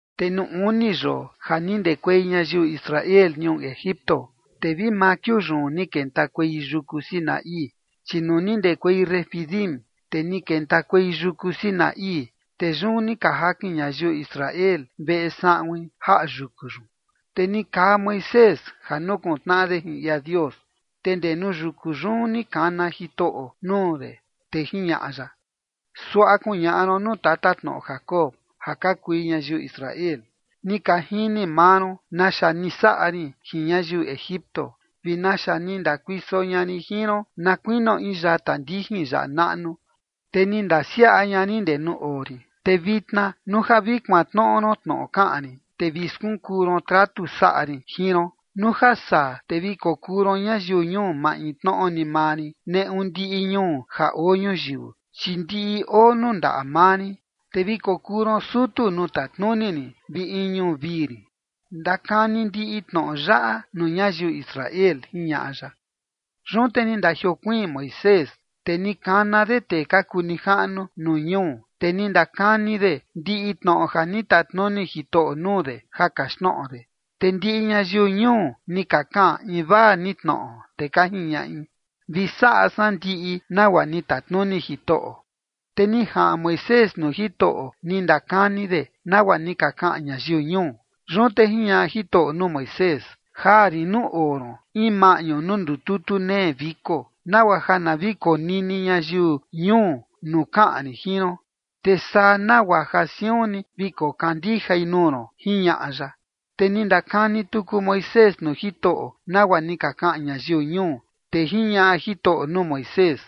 Te nuu uni yoo ja ni ndekuei ñayiu Israel ñuu Egipto, te vi maa kiuu yun ni kentakuei yuku Sinaí. Chi nuu ni ndekuei Refidim, te ni kentakuei yuku Sinaí, te yun ni ka jakin ñayiu Israel veꞌe saꞌuin jaꞌa yuku yun. Te ni kaa Moisés ja nukuntnaꞌa de jin ia Dios, te ndee nuu yuku yun ni kana Jitoꞌo nuu de, te jiñaꞌa ya: ―Suaꞌa kuñaꞌa ron nuu tatatnoꞌo Jacob ja ka kui ñayiu Israel: “Ni ka jini maa ron naxa ni saꞌa rin jin ñayiu Egipto, vi naxa ni ndakuiso ña rin jin ron na kuinio in yata ndijin yaꞌa naꞌnu, te ni ndisiaꞌa ña rin ndee nuu oo rin. Te vitna nuu ja vi kuantnoꞌo ron tnoꞌo kaꞌan rin, te vi skunkuu ron tratu saꞌa rin jin ron, nuu ja saa te vi kokuu ron ñayiu ñuu maintnoꞌo ni maa rin neꞌu ndiꞌi ñuu ja oo ñuyiu, chi ndiꞌi oo nuu ndaꞌa maa rin. Te vi kokuu ron sutu nuu tatnuni rin vi in ñuu vii rin.” Ndakani ndiꞌi tnoꞌo yaꞌa nuu ñayiu Israel ―jiñaꞌa ya. Yun te ni ndajiokuiin Moisés, te ni kana de tee ka kuu nijaꞌnu nuu ñuu, te ni ndakani de ndiꞌi tnoꞌo ja ni tatnuni Jitoꞌo nuu de ja kaxtnoꞌo de. Te ndiꞌi ñayiu ñuu ni ka kaꞌan invaa ni tnoꞌo, te ka jiñaꞌi: ―Vi saꞌa san ndiꞌi nagua ni tatnuni Jitoꞌo. Te ni jaꞌan Moisés nuu Jitoꞌo, ni ndakani de nagua ni ka kaꞌan ñayiu ñuu. Yun te jiñaꞌa Jitoꞌo nuu Moisés: ―Jaa rin nuu oo ron in maꞌñu nuu ndututu nee viko, nagua ja na vi konini ñayiu ñuu nuu kaꞌan rin jin ron. Te saa nagua ja siun ni vi kokandijai nuu ron ―jiñaꞌa ya. Te ni ndakani tuku Moisés nuu Jitoꞌo nagua ni ka kaꞌan ñayiu ñuu. Te jiñaꞌa Jitoꞌo nuu Moisés: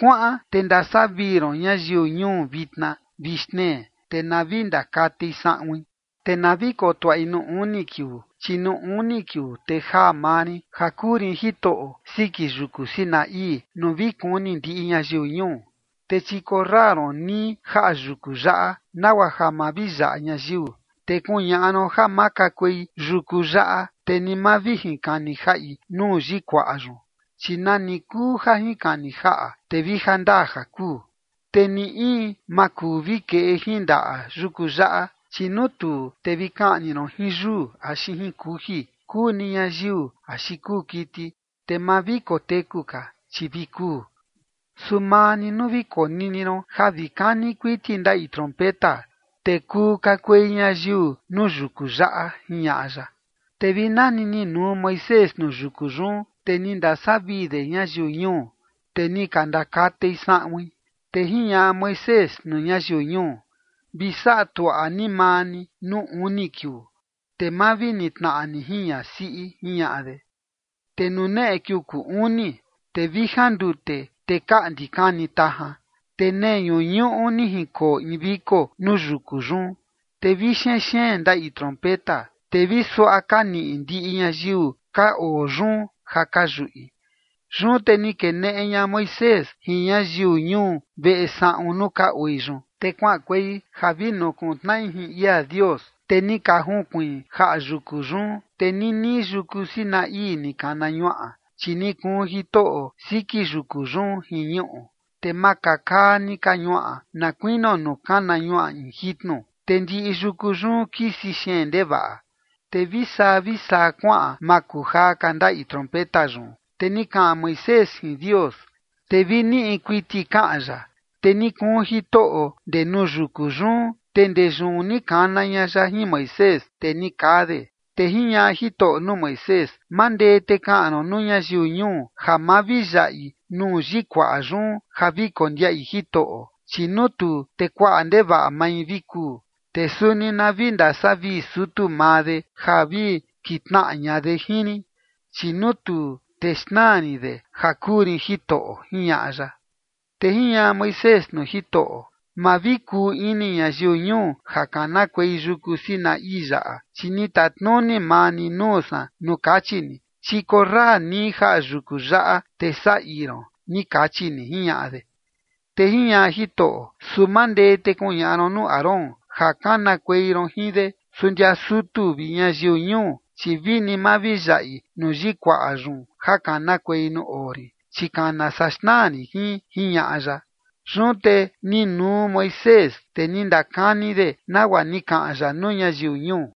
―Kuaꞌan te ndasavii ron ñayiu ñuu vitna vi xtnee, te na vi ndakatei saꞌuin. Te na vi kotuaꞌi nuu uni kiuu, chi nuu uni kiuu te jaa maa rin ja kuu rin Jitoꞌo siki yuku Sinaí, nuu vi kuni ndiꞌi ñayiu ñuu. Te chikorra ron nii jaꞌa yuku yaꞌa, nagua ja ma vi yaꞌa ñayiu. Te kuñaꞌa ron ja ma kakuei yuku yaꞌa, te ni ma vi jinkani jaꞌi nuu yikuaꞌa yun, chi nani kuu ja jinkani jaꞌa, te vi jandaa ja kuu. Te ni in ma kuu vi keꞌe jin ndaꞌa yuku yaꞌa, chi nuu tuu, te vi kaꞌni ron jin yuu axi jin kuji, kuu ni ñayiu axi kuu kiti, te ma vi koteku ka, chi vi kuu. Su maa ni nuu vi konini ron ja vi kani kuiti ndaꞌi trompeta, te kuu kakuei ñayiu nuu yuku yaꞌa ―jiñaꞌa ya. Te vi nani ni nuu Moisés nuu yuku yun, te ni ndasavii de ñayiu ñuu, te ni ka ndakatei saꞌuin. Te jiñaꞌa Moisés nuu ñayiu ñuu: ―Vi saꞌa tuaꞌa ni maa ni nuu uni kiuu, te ma vi nitnaꞌa ni jin ñasiꞌi ―jiñaꞌa de. Te nuu neꞌe kiuu kuu uni, te vi jandute, te kaꞌndi kani tajan, te nee ñuñuꞌu ni jinkoo in viko nuu yuku yun. Te vi xenxeen ndaꞌi trompeta, te vi suaꞌa ka niꞌi ndiꞌi ñayiu ka oo yun ja ka yuꞌi. Yun te ni keneꞌe ña Moisés jin ñayiu ñuu veꞌe saꞌun nuu ka oi yun, te kuaꞌankuei ja vi nukuntnaꞌi jin ia Dios, te ni ka junkuiin jaꞌa yuku yun. Te ninii yuku Sinaí ni kana ñuaꞌa, chi ni kuun Jitoꞌo siki yuku yun jin ñuꞌu, te makakaa ni ka ñuaꞌa na kuinio nuu kana ñuaꞌa in jitnu, te ndiꞌi yuku yun kisi xeen ndevaꞌa. Te vi saa vi saa kuaꞌan makujaa ka ndaꞌi trompeta yun. Te ni kaꞌan Moisés jin Dios, te vi niꞌi kuiti kaꞌan ya. Te ni kuun Jitoꞌo ndee nuu yuku yun, te ndee yun ni kana ña ya jin Moisés, te ni kaa de. Te jiñaꞌa Jitoꞌo nuu Moisés: ―Mandee te kaꞌan ron nuu ñayiu ñuu ja ma vi yaꞌi nuu yikuaꞌa yun ja vi kondiaꞌi Jitoꞌo, chi nuu tuu, te kuaꞌa ndevaꞌa mai vi kuu. Te suni na vi ndasavii sutu maa de ja vi kitnaꞌa ña de jin rin, chi nuu tuu, te xnaa rin de ja kuu rin Jitoꞌo ―jiñaꞌa ya. Te jiñaꞌa Moisés nuu Jitoꞌo: ―Ma vi kuu ini ñayiu ñuu ja kanakuei yuku Sinaí yaꞌa, chi ni tatnuni maa ni nuu san nuu kachi ni: “Chikorra nii jaꞌa yuku yaꞌa, te saꞌa ii ron”, ni kachi ni ―jiñaꞌa de. Te jiñaꞌa Jitoꞌo: ―Su mandee te kuñaꞌa ron nuu Aarón ja kanakuei ron jin de, su ndia sutu vi ñayiu ñuu, chi vini ma vi yaꞌi nuu yikuaꞌa yun ja kanakuei nuu oo rin, chi kana saa xnaa rin jin ―jiñaꞌa ya. Yun te ni nuu Moisés, te ni ndakani de nagua ni kaꞌan ya nuu ñayiu ñuu.